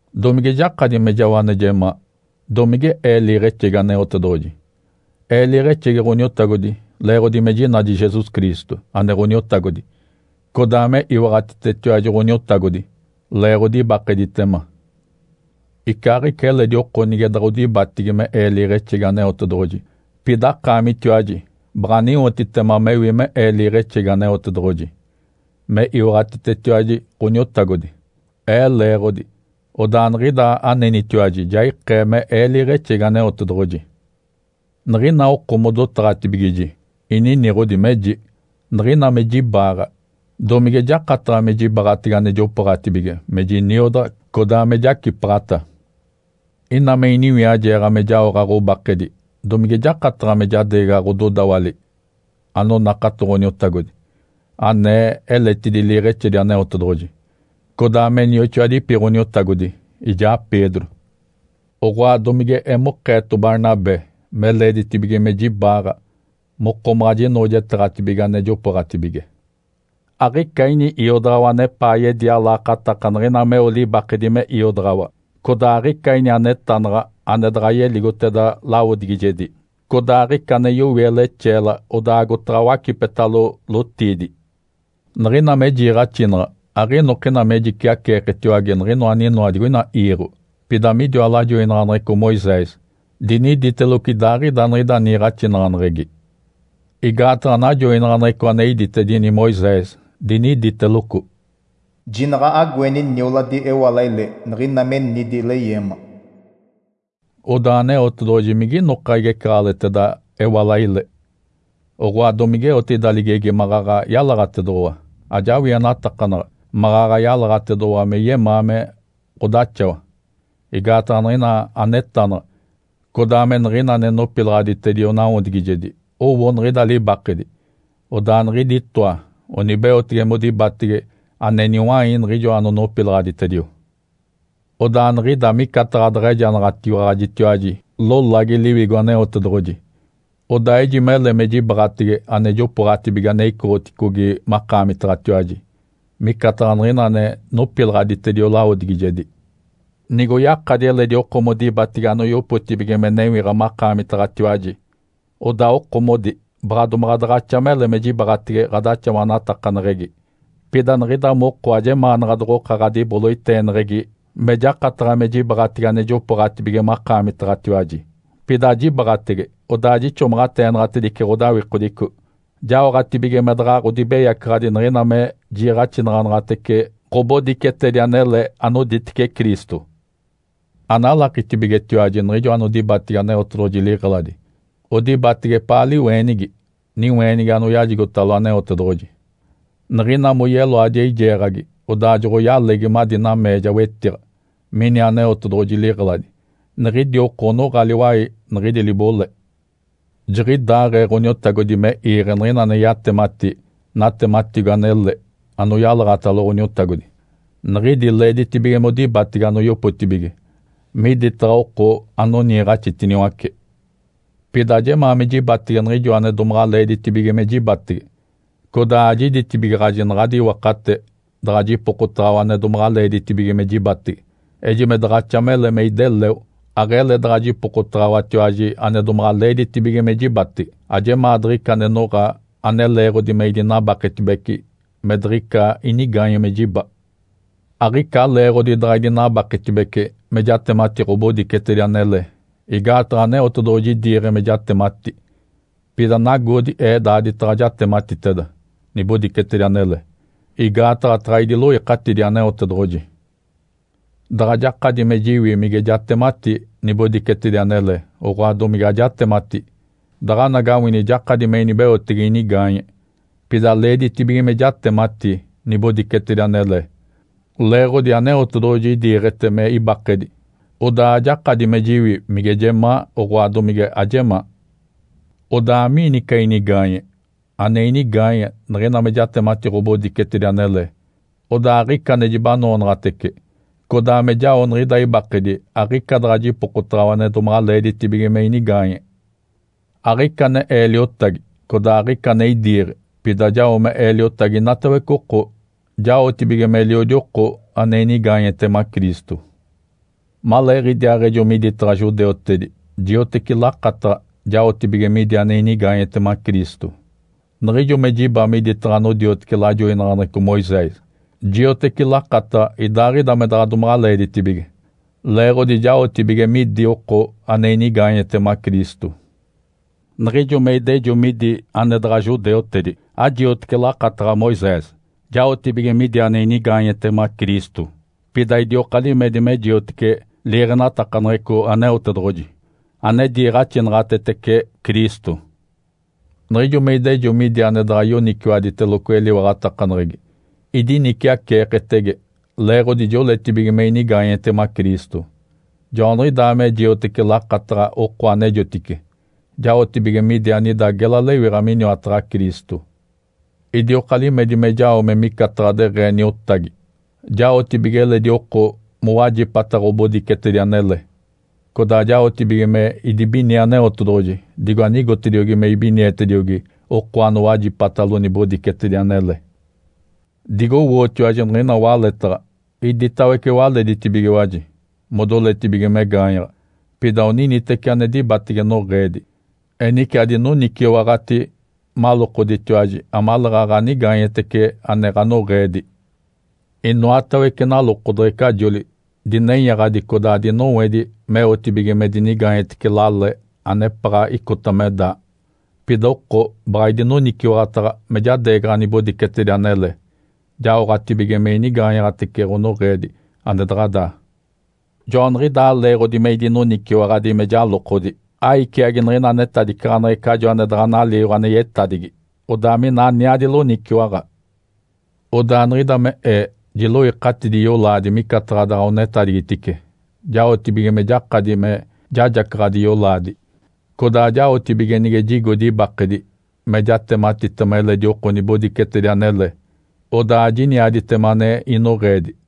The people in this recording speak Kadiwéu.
Domige jakadi me jao ane jemaa? Domige ee liiɡ̶exegi Aneotedoɡ̶oji? Ee liiɡ̶exegi Ǥoniotagodi leeɡ̶odi me jinadi Jesus Cristo, ane Ǥoniotagodi, codaa me iwaɡ̶atitetiwaji Ǥoniotagodi leeɡ̶odi ibakeditema. Icaaɡ̶ica eledi oko nige doɡ̶odibatigi me ee liiɡ̶exegi Aneotedoɡ̶oji, pida akaamitiwaji baɡ̶aniwotitema mewi me ee liiɡ̶exegi Aneotedoɡ̶oji. Me iwaɡ̶atitetiwaji Ǥoniotagodi ee leeɡ̶odi, odaa niɡ̶ida anenitiwaji ja ikee me ee liiɡ̶exegi Aneotedoɡ̶oji. Niɡ̶ina oko modotaɡ̶atibigiji, ininiɡ̶odi meji, “Niɡ̶ina me jibaaɡ̶a, domige jakataɡ̶a me jibaɡ̶atege ane jopooɡ̶atibige me jiniodaɡ̶a, codaa me jacipaɡ̶ata? Ina me iniwiajeeɡ̶a me jaoɡ̶a ɡ̶obakedi, domige jakataɡ̶a me jadeegaɡ̶a ɡ̶ododawali anonakato Ǥoniotagodi, anee eletidi liiɡ̶exedi Aneotedoɡ̶oji, codaa me nioxoadipi Ǥoniotagodi, ijaa Pedro? Oɡ̶oa, domige emokeeto Barnabé me leeditibige me jibaaɡ̶a mokomaɡ̶a jinoojeteeɡ̶atibige ane jopooɡ̶atibige? Aɡ̶ica ini iodaɡ̶awa anepaa yedia laakataka niɡ̶ina meo ane libakedi me iodaɡ̶awa. Codaa aɡ̶ica ini anetanaɡ̶a, ane daɡ̶a yeligoteda lawodigijegi. Codaa aɡ̶ica ane yowie lexeela, odaa agotaɡ̶a wacipetalo lotiidi.” Niɡ̶ina me jiiɡ̶axinaɡ̶a, aɡ̶inokina me jiciaceeketiwage niɡ̶inoa aninoa digoina iiɡ̶o, pida midiwa lajoinaɡ̶aneɡ̶eco Moisés diniditeloco idaaɡ̶ida niɡ̶ida niiɡ̶axinaɡ̶aneɡ̶egi. Igaataɡ̶a najoinaɡ̶aneɡ̶eco ane iditedini Moisés, diniditeloco, “Jinaɡ̶a agoeni nioladi ewalaile niɡ̶ina me nidi leyeema.” Odaa Aneotedoɡ̶oji mige inoka igecaɡ̶aleɡ̶eteda ewalaile? Oɡ̶oa domigeote ida ligegi maɡ̶aɡ̶a yalaɡ̶atedoɡ̶owa? Ajawienatakanaɡ̶a maɡ̶aɡ̶a yalaɡ̶atedoɡ̶owa me yemaa me ɡ̶odaxawa. Igaataɡ̶a niɡ̶ina anetanaɡ̶a, codaa me niɡ̶ina ane nopilaɡ̶aditedio nawodigijedi owo niɡ̶ida libakedi, odaa niɡ̶idi itoa onibeotege modibatege ane niwai niɡ̶ijoa anonopilaɡ̶aditedio. Odaa niɡ̶ida micataɡ̶a daɡ̶a ejanaɡ̶atiwaɡ̶ajitiwaji lolagi Liwigo Aneotedoɡ̶oji. Odaa ejimele me jibaɡ̶atege ane jopooɡ̶atibige ane icoɡ̶oticogi makaamitaɡ̶atiwaji, micataɡ̶a niɡ̶ina ane nopilaɡ̶aditedio lawodigijedi. Nigoyakadi eledi oko modibatege anoyopotibige me newiɡ̶a akaamitiwaji, odaa okomodi baɡ̶a domaɡ̶a daɡ̶axa mele me jibaɡ̶atege ɡ̶adaxawatakaneɡ̶egi. Pida niɡ̶ida moko ajemaanaɡ̶a doɡ̶oka ɡ̶adiboloiteeneɡ̶egi me jakataɡ̶a me jibaɡ̶atege ane jopooɡ̶atibige makaamitaɡ̶atiwaji. Pida ajibaɡ̶atege, odaa jixomaɡ̶ateenaɡ̶atedice ɡ̶odawikodico, jaoɡ̶atibige me daɡ̶a ɡ̶odibeyacaɡ̶adi niɡ̶ina me jiiɡ̶axinaɡ̶anaɡ̶atece ɡ̶obodicetedi anele anoditece Cristo. Analakitibigetiwaji niɡ̶ijo anodibatigi Aneotedoɡ̶oji liɡ̶eladi odibatege epaa liweenigi, niweenigi anoyajigotalo Aneotedoɡ̶oji? Niɡ̶ina moyeloadi eijeeɡ̶agi odaa joɡ̶oyalegi madi nameeja wetiɡ̶a mini Aneotedoɡ̶oji liɡ̶eladi, niɡ̶idi oko onoɡ̶a liwai niɡ̶idi libole. Jiɡ̶idaaɡ̶ee Ǥoniotagodi me iiɡ̶e niɡ̶ina ane yatemati natematigo anele anoyalaɡ̶atalo Ǥoniotagodi, niɡ̶idi leeditibige modibatege anoyopotibige miditaɡ̶a oko anoniiɡ̶axitiniwace. Pida ajemaa me jibatege niɡ̶ijo ane domaɡ̶a leeditibige me jibatege, codaa ajiditibigaɡ̶aji naɡ̶adi iwakate daɡ̶a jipokotaɡ̶awa ane domaɡ̶a leeditibige me jibatege. Ejime daɡ̶axa mele me ideleo, aɡ̶ele daɡ̶a jipokotaɡ̶awatiwaji ane domaɡ̶a leeditibige me jibatege. Ajemaa diɡ̶ica ane noɡ̶a ane leeɡ̶odi me idinabaketibece me diɡ̶ica inigaanye me jiba. Aɡ̶ica leeɡ̶odi daɡ̶a idinabaketibece me jatemati ɡ̶obodicetedi anele, igaataɡ̶a Aneotedoɡ̶oji idiiɡ̶e me jatemati. Pida nagoodi ee daaditaɡ̶a jatematiteda nibodicetedi anele, igaataɡ̶a taɡ̶a idiloikatidi Aneotedoɡ̶oji! Daɡ̶a jakadi me jiwi mige jatemati nibodicetedi anele, oɡ̶oa domige ajatemati, daɡ̶anagawini jakadi me inibeotege inigaanye. Pida leeditibige me jatemati nibodicetedi anele leeɡ̶odi Aneotedoɡ̶oji idiiɡ̶ete me ibakedi, odaa ajakadi me jiwi mige jemaa, oɡ̶oa domige ajemaa. Odaa, amiini ica inigaanye? Ane inigaanye, niɡ̶ina me jatemati ɡ̶obodicetedi anele, odaa aɡ̶ica ane jibanoonaɡ̶atece, codaa me jao niɡ̶ida ibakedi aɡ̶ica daɡ̶a jipokotaɡ̶awa ane domaɡ̶a leeditibige me inigaanye. Aɡ̶ica ane ee liotagi, codaa aɡ̶ica ane idiiɡ̶e. Pida jao me ee liotagi inatawece oko jaotibige meliodi oko ane inigaanyetema Cristo. Maleeɡ̶idiaaɡ̶ejo miditaɡ̶a judeutedi, jioteci lakataɡ̶a jaotibige midi ane inigaanyetema Cristo. Niɡ̶ijo me jiba miditaɡ̶a anodioteci liiɡ̶axinaɡ̶aneɡ̶eco Moisés, jioteci lakataɡ̶a idaaɡ̶ida me daɡ̶a domaɡ̶a leeditibige, leeɡ̶odi jaotibige midi oko ane inigaanyetema Cristo. Niɡ̶ijo me idejo midi ane daɡ̶a judeutedi ajiotece lakataɡ̶a Moisés, jaotibige midi ane inigaanyetema Cristo. Pida idioka limedi me jiotece liiɡ̶enatakaneɡ̶eco Aneotedoɡ̶oji, ane diiɡ̶axinaɡ̶atetece Cristo. Niɡ̶ijo me idejo midi ane daɡ̶a yoniciwaditeloco eliwaɡ̶atakaneɡ̶egi, idiniciaceeketege, leeɡ̶odi joletibige me inigaanyetema Cristo. Joaniɡ̶idaa me jioteci lakataɡ̶a oko anejotice, jaotibige midi anida gela lewiɡ̶a miniwataɡ̶a Cristo. Idioka limedi me jao me micataɡ̶a deɡ̶ee niotagi jaotibige eledi oko mowajipata ɡ̶obodicetedi anele, codaa jaotibige me idibinie Aneotedoɡ̶oji digo anigotediogi me ibinietediogi oko anowajipatalo nibodicetedi anele. Digowootiwaji niɡ̶ina waletaɡ̶a, iditawece waleditibigiwaji modoletibige me gaanyaɡ̶a. Pida oniniteci ane dibatege noɡ̶eedi. Enice adinoniciwaɡ̶ati malokoditiwaji amaleeɡ̶aɡ̶a anigaanye ane ɡ̶anoɡ̶eedi. Inoatawece nalokodeɡ̶ecajoli dinenyaɡ̶adi codaa dinowedi meotibige me dinigaanyetece lale anepaɡ̶a icota me daa. Pida oko baɡ̶a idinoniciwaɡ̶ataɡ̶a me jadeegaɡ̶a nibodicetedi anele jaoɡ̶atibige me inigaanyaɡ̶atece ɡ̶onoɡ̶eedi ane daɡ̶a daa. Joaniɡ̶idaa leeɡ̶odi me idinoniciwaɡ̶adi me jalokodi, aiciagi niɡ̶ina netadicaɡ̶aneɡ̶ecajo ane daɡ̶a naliiɡ̶o ane yetadigi, odaa mina aniadi loniciwaɡ̶a. Odaa niɡ̶ida me ee jiloikatidi yolaadi micataɡ̶a daɡ̶a onetadigitice, jaotibige me jakadi me jajacaɡ̶adi yolaadi. Codaa jaotibige nige jigodi ibakedi me jatematitema eledi oko nibodicetedi anele, odaa ajiniaditema ane inoɡ̶eedi.